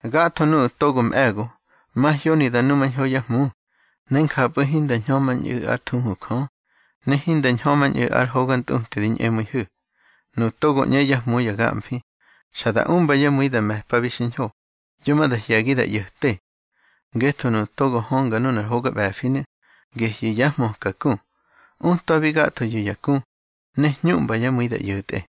Gatho nuꞌu̱ togo mꞌe̱go, mahyoni da numañho yá hmu, ne njapꞌu̱ hinda ñhömañꞌu̱ ár thuhu Jö, ne hinda ñhömañꞌu̱ ar hoga ntꞌuti di ñꞌemu̱ihu̱. Nuꞌu̱ togo ꞌñe yá hmu ya gamfi, xa da umba yá mu̱i da me̱pabi xiñho, yo ma da hye̱gi da ꞌyo̱te. Ngetho nuꞌu̱ togo hönga nunar hoga ꞌbe̱finu̱, gehyu̱ yá hmöka ku. Utwabi gathoyu̱ ya ku, ne hñuꞌmba yá mu̱i da ꞌyo̱tꞌe.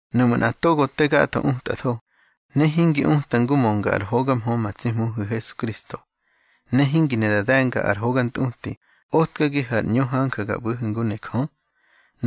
Nuꞌmu̱ nꞌa togo te gatho utatho, ne hingi uta ngu mönga ár hoga mhö ma tsi Hmuhu̱ Hesukristo, ne hingi ne da de̱nga ar hoga ntꞌuti otkagihu̱ ar ꞌñu hanja ga ꞌbu̱hu̱ ngu ne Jö,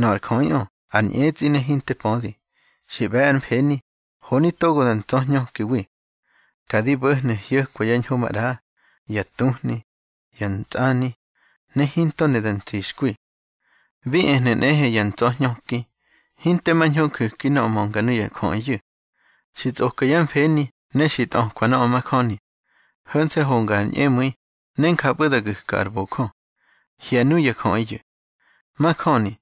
nöꞌö ar jöꞌiꞌö ar ñꞌetsꞌi ne hinte pödi, xi ꞌbe̱ ár mfeni, honi togo da ntsa̱hñökiwi. Ka di bo̱hnu̱ hyo̱kwa yá ñho maꞌra, ya tuhni, ya ntsꞌani, ne hinto ne da ntsixkwi. Bi ehnu̱ nꞌehe ya ntsa̱hñöki, hinte mañho nju̱ki nöꞌö mönga nuya jöꞌiyu̱. Xi tsꞌoka yá mfeni ne xi tꞌökwa nöꞌö majöni. Ho̱nse̱ honga ar ñꞌemu̱i, ne njapꞌu̱ da gu̱ka ar bojö. Hye̱ nuya jöꞌiyu̱. Majöni,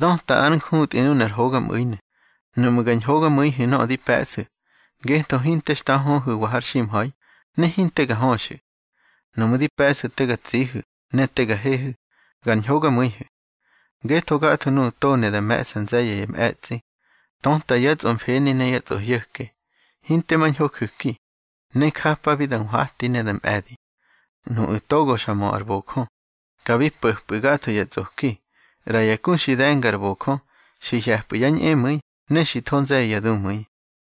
döta ár njutꞌi nunar hogamꞌu̱inu̱, nuꞌmu̱ ga ñhogamu̱ihu̱ nöꞌö di pe̱ꞌsu̱. Ngetho hinte xta höhu̱wa har ximha̱i, ne hinte ga höxu̱. Nuꞌmu̱ di pe̱ꞌsu̱ te ga tsihu̱ ne te ga hehu̱, gar ñhogamu̱ihu̱. Ngetho gatho nuꞌu̱ togo ne da me̱ꞌsa nze̱ye̱ ya mꞌe̱tsꞌi, töta yá tsꞌomfeni ne yá tsꞌohyo̱ke. Hinte mañho ju̱ki, ne njapabi da nhwati ne da mꞌe̱di. Nuꞌu̱ togo xa mö ar bojö, ka bi po̱pꞌu̱ gatho ya tsꞌoki. ꞌRa ya ku xi de̱nga ar bojö, xi hye̱pꞌu̱ yá ñꞌemu̱i ne xi tho nze̱ye̱ ya dumu̱i.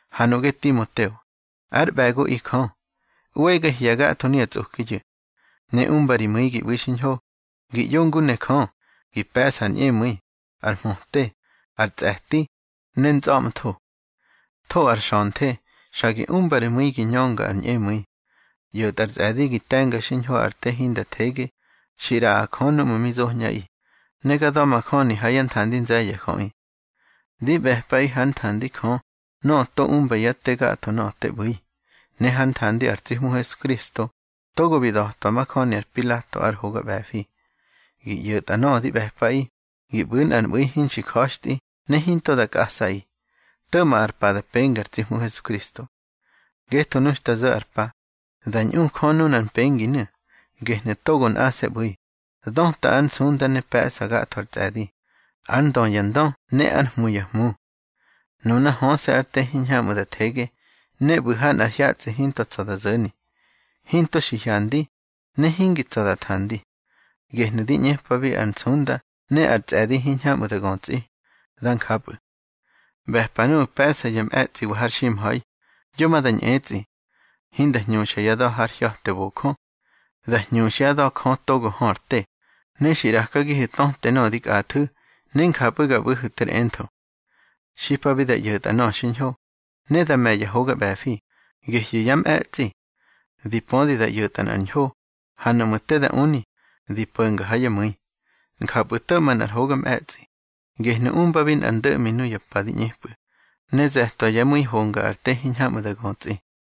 Ha nuꞌge Timoteo, ár ꞌbe̱goꞌi Jö, ꞌwege hye̱ gatho nuya tsꞌokiyu̱. Ne umba ri mu̱i gi ꞌbu̱i xiñho, gi ꞌyo ngu ne Jö, gi pe̱ꞌsa ar ñꞌemu̱i, ar mhöte, ar tsꞌe̱ti, ne ntsꞌa̱ꞌmtho. Tho ar xa̱nthe, xa gi umba ri mu̱i gi ñönga ar ñꞌemu̱i. ꞌYo̱tꞌa ar tsꞌe̱di gi te̱nga xiñho ar te hinda thege xi ꞌraꞌa Jö núꞌmu̱ mi zoñꞌaꞌi, ne ga da̱majöni ha yá nthandi nze̱ye̱ ya jöꞌi. Di ꞌbe̱pꞌaꞌi hár nthandi Jö nöꞌö to umba yá te gatho nöꞌö te ꞌbu̱i, ne hár nthandi ar tsi Hmu Hesukristo togo bi da̱twa majöni ar Pilato ár hoga ꞌbe̱fi, gi ꞌyo̱tꞌa nöꞌö di ꞌbe̱pꞌaꞌi, gi ꞌbu̱ nꞌar mꞌu̱i hinxi ja̱xtꞌi ne hinto da kꞌasꞌaꞌi, to̱ꞌma ar pa da penga ar tsi Hmu Hesukristo. Ngetho nu xta zo̱ ar pa, da ñꞌu Jö nunar mpenginu̱, gehnu̱ togo nꞌase̱ ꞌbu̱i, döta ár nsunda ne pe̱ꞌsa gatho ar tsꞌe̱di, ár Ndö ya ndö ne ár Hmu ya hmu. Nuna höse̱ ár te hiñhamꞌu̱ da thege, ne ꞌbu̱ ha nꞌar hyatsꞌi hinto tsa̱ da zo̱ni. Hinto xi hyandi, ne hingi tsa̱ da thandi. Gehnu̱ di ꞌñepabi ar nsunda ne ar tsꞌe̱di hiñhamꞌu̱ da götsꞌi. Dá njapꞌu̱. ꞌBe̱pa nuꞌu̱ pe̱ꞌsa yá mꞌe̱tsꞌiwa har ximha̱i, yo ma da ñꞌetsꞌi. Hinda hñuxyá da̱ har hya̱te bojö. Dá hñuxyá da̱ Jö togo hö ar te, ne xi ꞌrakagihu̱ töte nöꞌö di kꞌathu̱, ne njapꞌu̱ ga ꞌbu̱hu̱ ter entho. Xipabi da ꞌyo̱tꞌa nöꞌö xiñho, ne da me̱ ya hoga ꞌbe̱fi, gehyu̱ yá mꞌe̱tsꞌi. Di pödi da ꞌyo̱tꞌa nꞌar ñho, ha nuꞌmu̱ te da uni, di po̱nga ha yá mu̱i. Njapꞌu̱ to̱ꞌma nꞌar hoga mꞌe̱tsꞌi, gehnu̱ umbabi nꞌar ndo̱ꞌmi nuya pa di ꞌñepꞌu̱, ne ze̱twa yá mu̱i honga ar te hiñhamꞌu̱ da götsꞌi.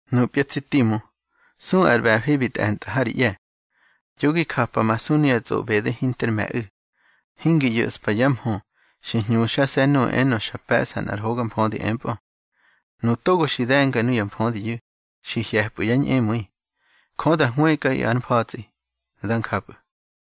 Nupya tsi Timu, su ar ꞌbe̱fi bi tꞌe̱ntꞌa ha ri ꞌye̱. Yo gi japamasu nuya tsꞌoꞌbede hinter me̱ꞌu̱. Hingi ꞌyo̱ꞌspa yá mhö xi hñuxase̱ nuꞌu̱ enö xa pe̱ꞌsa nꞌar hoga mfödi empꞌö. Nuꞌu̱ togo xi de̱nga nuya mfödiyu̱, xi hye̱pꞌu̱ yá ñꞌemu̱i. Jö da hwëkꞌaꞌi ár mfa̱tsꞌi. Dá njapꞌu̱.